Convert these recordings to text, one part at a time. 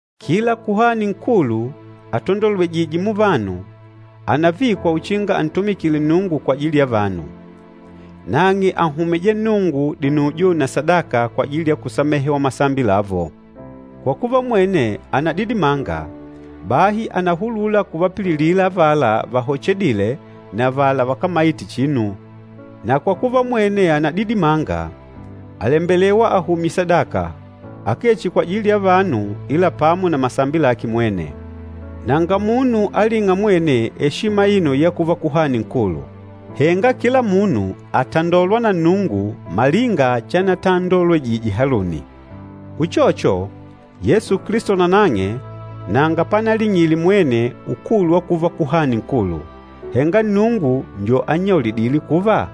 Kila Kuhani Nkulu atandolwejîje muvanu, ànavikwa uchinga antumikile Nnungu kwajili ya vanu. Nang'e ànhumija Nnungu dinujo na sadaka kwajili ya kusamehewa masambi lavo. Kwa kuva mwene ànadidimanga, bahi ànahulula kuvapililila avala vahochedîle na avala vakámaite chinu. Na kwa kuva mwene ànadidimanga, àlembelewa ahumye sadaka, akee chihi kwajili ya vanu ila pamo na masambi lake mwene. Nanga munu alîng'a mwene eshima aino ya kuva Kuhani Nkulu. Henga kila munu àtandolwa na Nnungu malinga chanatandolwejije Haluni. Uchocho, Yesu Kilisto nanang'e nanga panaling'ile mwene ukulu wa kuva Kuhani Nkulu, henga Nnungu njo annyaulidîle kuva,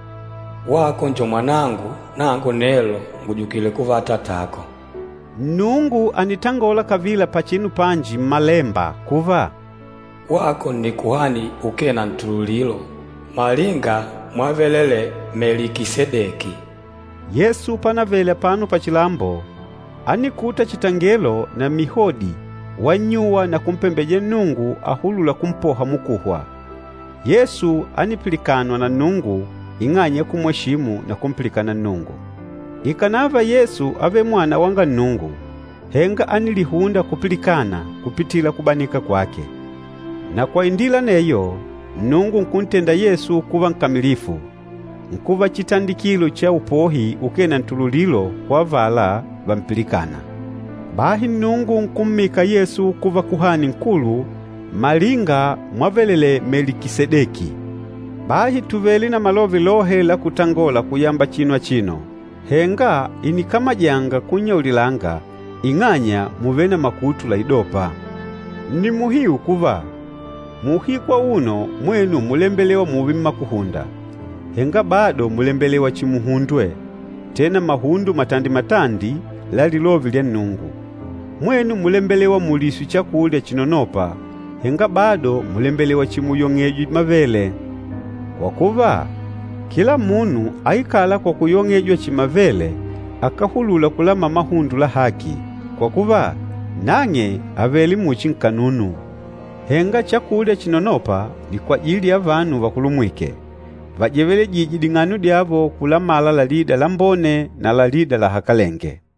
“Wako njo Mwanangu, nangu nelo ngùjukile kuva Atatako.” Nnungu ànitangola kavila pachinu panji Mmalemba kuva, “Wako nni Kuhani ukee na ntululilo, malinga mwavelelee Melikisedeki.” Yesu panavele apano pachilambo, ánikuta chitangelo na mihodi wannyuwa na kumpembeja Nnungu ahulûla kumpoha mukuhwa. Yesu ánipilikanwa na Nnungu ing'anya ya kumweshimu na kumpilikana Nnungu. Ikànava Yesu ávele Mwana wanga Nnungu, henga ánilihunda kupilikana kupitila kubanika kwake. Na kwa indila aneyo, Nnungu nkuntenda Yesu kuva nkamilifu, nkuva chitandikilo cha upohi ukee na ntululilo kwa avala vampilikâna. Bahi Nnungu nkummika Yesu kuva Kuhani Nkulu, malinga mwavelelee Melikisedeki. Bahi tùvele na malove lohe la kutangola kuyamba chinu achino, henga ìnikamajanga kunnyaulilanga ing'anya mùvele na makutu laidôpa. Nni muhiu kuva, muuhiku auno mwenu múlembelewa mùùve mmakuhunda, henga bado mùlembelewa chihi muhundwe, tena mahundo matandi-matandi la lilove lya Nnungu. Mwenu múlembelewa muliswe chakulya chinonôpa, henga bado mùlembelewa chihi muyong'ejwe mavele. Kwa kuva, kila munu aikâla kwa kuyong'ejwa chihi mavele akáhulula kulamala mahundo la haki, kwa kuva, nang'e àvele muchi nkanunu. Henga chakulya chinonôpa ni kwajili ya vanu vakulumwîke, vajevelejîje ding'ano dyavo kulamala lalida lambone na lalida lahakalenge.